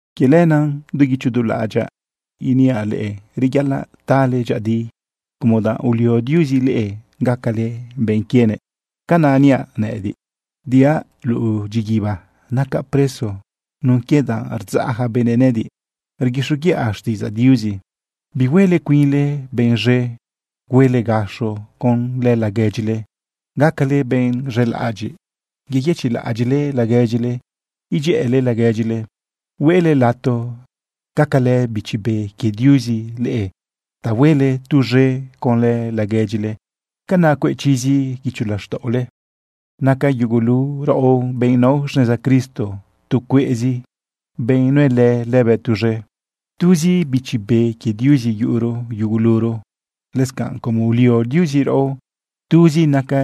Quie lenaꞌ du guicho du laꞌadyaꞌ iniaꞌ leꞌe reyaꞌalaꞌ tale dyëꞌëdi como danꞌ ulio Diuzi leꞌe gacale benꞌ quienëꞌ. Canaꞌ niaꞌ nëꞌëdiꞌ diaꞌ luꞌu dyiguiba nacaꞌ preso nun quie danꞌ rdzaꞌ yaca benëꞌ nëꞌëdiꞌ rguixoguiꞌa xtiꞌidzaꞌ Diuzi. Bihuele cuinle benꞌ z̃e, huele gaxo conlë laguedyile. Gacale benꞌ z̃elaꞌadyiꞌ, yeyëchiꞌlaꞌadyiꞌle laguedyile, idyëꞌële laguedyile. Huele lato gacalë Bichi Be quie Diuzi leꞌe ta huele tuz̃e conlë laguedyile, canaꞌ cueꞌ chizi guicho laxtaꞌole. Naca yugulu raꞌo, benꞌ nao xneza Cristo, tu cueꞌzi benꞌ nuelë lëbëꞌ tuz̃e. Tuzi Bichi Be quie Diuzi yuꞌuro yuguluro. Lëscanꞌ como ulio Diuzi raꞌo, tuzi naca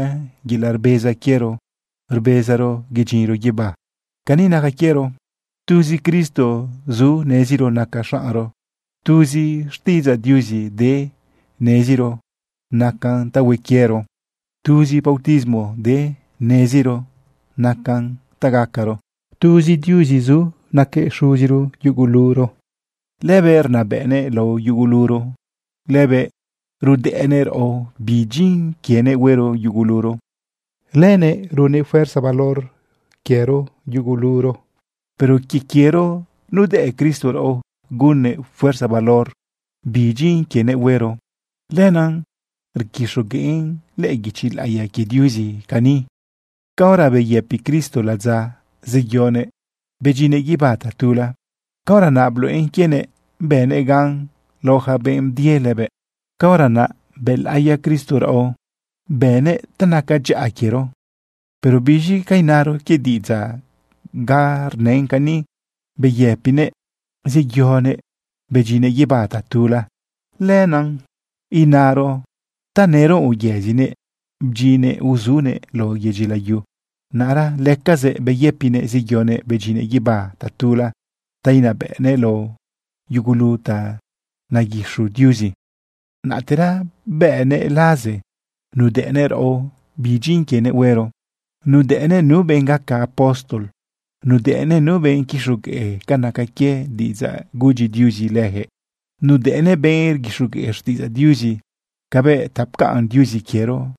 yelaꞌ rbeza quiero rbezaro yedyinro guibá. Cani naca quiero: Tuzi Cristo zu neziro naca xaꞌnro, tuzi xtiꞌidzaꞌ Diuzi de neziro nacan ta hue quiero, tuzi bautismo de neziro nacan ta gacaro. Tuzi Diuzi zu naquëꞌ Xuziro yuguluro. Lëbëꞌ rnabëꞌnëꞌ lao yuguluro, lëbëꞌ rudëꞌnëꞌ raꞌo bi dyin quienëꞌ huero yuguluro, lëbëꞌ runnëꞌ fuerza valor de quiero yuguluro. Pero quie quiero nudëꞌ Cristo raꞌo gunnëꞌ fuerza valor bi dyin quienëꞌ huero. Lenaꞌ rguixogueꞌn lëꞌë guichi laꞌiya quie Diuzi cani: Caora beyëpi Cristo ladza zeyonëꞌ bedyinnëꞌ guibá tatula, caora naꞌ bluꞌen quienëꞌ bënëꞌ gan lao yaca benꞌ bdie lëbëꞌ. Caora naꞌ bëlaꞌiya Cristo raꞌo, bënnëꞌ ta naca dyaꞌa quiero. ¿Pero biz̃i ca inaro quie diꞌidzaꞌ ganꞌ rnën cani: “Beyëpinëꞌ zeyonëꞌ bedyinnëꞌ guibá tatula”? Lenaꞌ inaro tanëro uyëzinëꞌ bdyinnëꞌ uzunëꞌ lao yedyi layu. Naꞌra lëcazëꞌ beyëpinëꞌ zeyonëꞌ bedyinnëꞌ guibá tatula ta inabëꞌnëꞌ lao yugulu ta naguixu Diuzi. Naꞌtera bënnëꞌ laze nudëꞌnëꞌ raꞌo bi dyin quienëꞌ huero. Nudëꞌnëꞌ nu benꞌ gaca apóstol. Nudëꞌnëꞌ nu benꞌ quixogueꞌ ca naca quie diꞌidzaꞌ gudyi Diuzi lëjëꞌ. Nudëꞌnëꞌ benꞌ rguixogueꞌ xtiꞌidzaꞌ Diuzi cabëꞌ ta pcaꞌn Diuzi quiero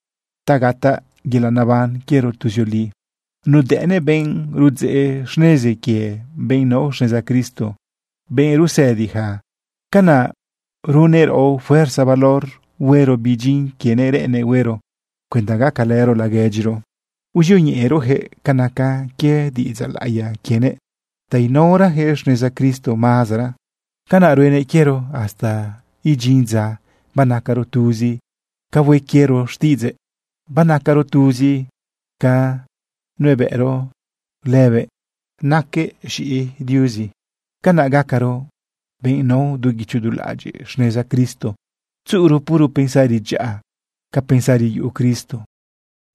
ta gataꞌ yelaꞌ neban quiero tuzioli. Nudëꞌnëꞌ benꞌ rudzeꞌ xnezi quie benꞌ nao xneza Cristo, benꞌ rusëdi yaca. Canaꞌ runnëꞌ raꞌo fuerza valor huero bi dyin quienëꞌ reꞌennëꞌ huero cuenda gacalëro laguedyiro uzioñeꞌerojëꞌ ca naca quie diꞌidzaꞌ laꞌiya quienëꞌ ta inaorayaquëꞌ xneza Cristo mazara. Canaꞌ ruenëꞌ quiero hasta idyin dza banacaro tuzi ca hue quiero xtiꞌidzëꞌ, banacaro tuzi ca nuebëꞌro lëbëꞌ raquëꞌ z̃iꞌi Diuzi. Canaꞌ gacaro benꞌ nao du guicho du laꞌadyiꞌ xneza Cristo, tzuꞌuro puro pensari dyaꞌa ca pensari yuꞌu Cristo.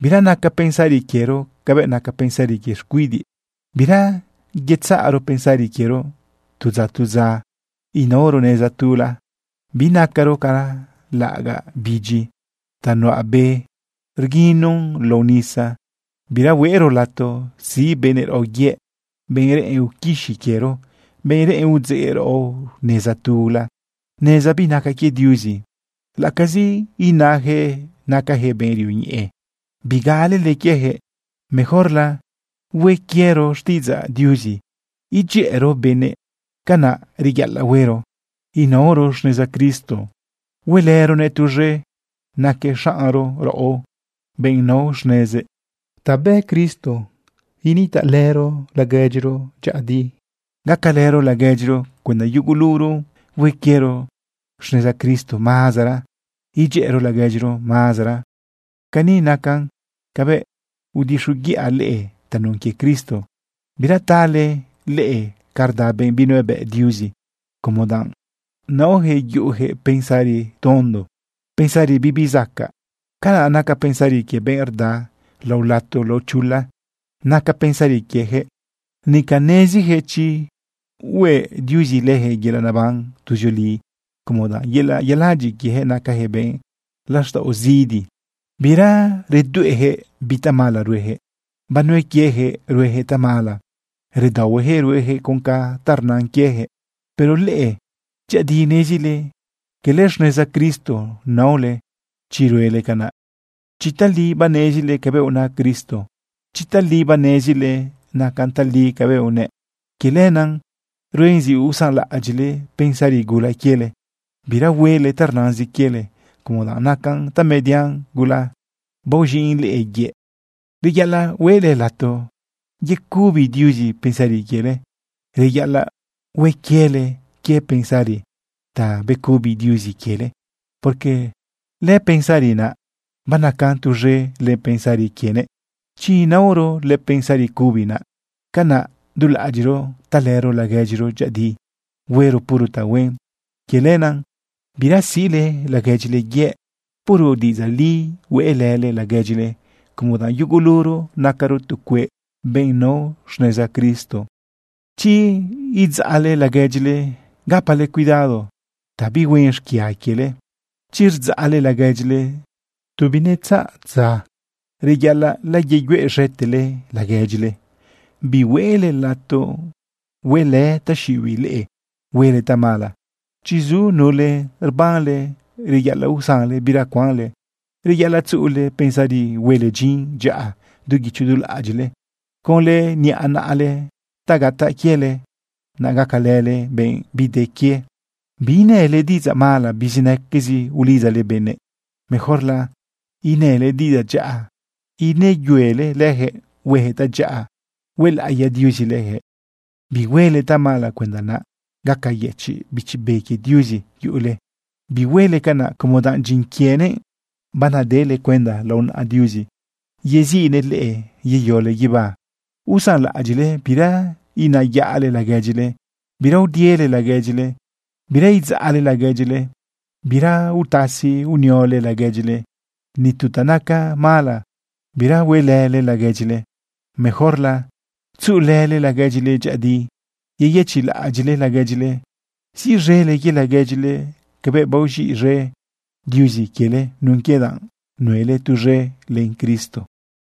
Bira naca pensari quiero cabëꞌ naca pensari quie xcuidiꞌ. Bira yetzaꞌro pensari quiero tu dza tu dza inaoro neza tula. Binacaro ca laꞌagaꞌ bidyi ta nuꞌa be rguinun lao nisa. Bira hueꞌro lato siꞌ benëꞌ raꞌo yëꞌ, benꞌ reꞌen uquixi quiero, benꞌ reꞌen udzeꞌ raꞌo neza tula, neza binaca quie Diuzi. Laꞌacazi inayaquëꞌ nacayaquëꞌ benꞌ rioñeꞌe, bigalele quiejëꞌ. Mejorla hue quiero xtiꞌidzaꞌ Diuzi edyëꞌëro benëꞌ. Canaꞌ reyaꞌalaꞌ huero inaoro xneza Cristo, huelëronëꞌ tuz̃e, naquëꞌ xaꞌnro raꞌo, benꞌ nao xnezëꞌ. Ta bë Cristo nitaꞌlëro laguedyiro dyëꞌëdi gacalëro laguedyiro cuenda yuguluro hue quiero xneza Cristo mazara, edyëꞌëro laguedyiro mazara. Cani nacan cabëꞌ udixoguiꞌa leꞌe tanun quie Cristo: Bira tale leꞌe ca rda benꞌ binuebëꞌ Diuzi, como danꞌ naojëꞌ yuꞌujëꞌ pensari tondo, pensari bibi zacaꞌ ca naca pensari quie benꞌ rda lao lato lao chula naca pensari quieyaquëꞌ. Nica neziziyaquëꞌ chi hueꞌ Diuzi leyaquëꞌ yelaꞌ neban tuzioli, como danꞌ yelaꞌ yeladyiꞌ quiejëꞌ nacajëꞌ benꞌ laxtaꞌo zidi. Bira redueꞌyaquëꞌ bi tamala rueyaquëꞌ. Banue quieyaquëꞌ rueyaquëꞌ tamala. Redaohueyaquëꞌ rueyaquëꞌ con ta rnan quieyaquëꞌ. Pero leꞌe, dyëꞌëdi nezile, cala xneza Cristo naole chi ruele canaꞌ. Chi tali banezile cabëꞌ una Cristo, chi tali banezile nacan tali cabëꞌ unëꞌ, quie lenaꞌ ruen zi usanlaꞌadyiꞌle pensari gula quiele. Bira huele ta rnazin quiele, como danꞌ nacan tamedian gula, baoz̃iꞌn leꞌe yëꞌ. Reyaꞌalaꞌ hueꞌle lato yecubi Diuzi pensari quiele. Reyaꞌalaꞌ hue quiele quie pensari ta becubi Diuzi quiele, porque lëpensari naꞌ banacan tuz̃e len pensari quienëꞌ. Chi inaoro lëpensari cubi naꞌ, canaꞌ du laꞌadyiꞌro talëro laguedyiro dyëꞌëdi, huero puro tahuen. Quie lenaꞌ bira siꞌle laguedyile yëꞌ. Puro diꞌidzaꞌ li hueꞌlële laguedyile, como danꞌ yuguluro nacaro tu cueꞌ benꞌ nao xneza Cristo. Chi idzaꞌle laguedyile, gapale cuidado ta bihuen xquia quiele. Chi rdzaꞌle laguedyile, tu binegala dza reyaꞌalaꞌ layeyueꞌz̃etele laguedyile. Bihueꞌle lato huelë taxiꞌibiꞌ leꞌe huele tamala. Chi zu nule rbanle, reyaꞌalaꞌ usanle bira cuanle. Reyaꞌalaꞌ tzuꞌule pensari huele dyin dyaꞌa du guicho du laꞌadyiꞌle conlë niꞌa naꞌale ta gataꞌ quiele, naꞌ gacalële benꞌ bide quie. Biinële diꞌidzaꞌ mala bizinaque ulidzale benëꞌ. Mejorla inële diꞌidzaꞌ dyaꞌa ineyuele leyaquëꞌ hueyaquëꞌ tadyaꞌa huelaꞌiya Diuzi lëjëꞌ. Bihuele tamala cuenda naꞌ gaqueyëchiꞌ Bichi Be quie Diuzi yuꞌule. Bihuele canaꞌ como danꞌ dyin quienëꞌ banadele cuenda lao naꞌa Diuzi yeziꞌnëꞌ leꞌe yeyole guibá. Usanlaꞌadyiꞌle, bira inayaꞌle laguedyile, bira udiele laguedyile, bira idzaꞌle laguedyile, bira utasi uniole laguedyile. Ni tu ta naca mala bira huelële laguedyile. Mejorla tzuꞌulële laguedyile dyëꞌëdi, yeyëchiꞌlaꞌadyiꞌle laguedyile, siꞌz̃ele quie laguedyile cabëꞌ baoz̃iꞌe Diuzi quiele nun quie danꞌ nuelë tuz̃e len Cristo.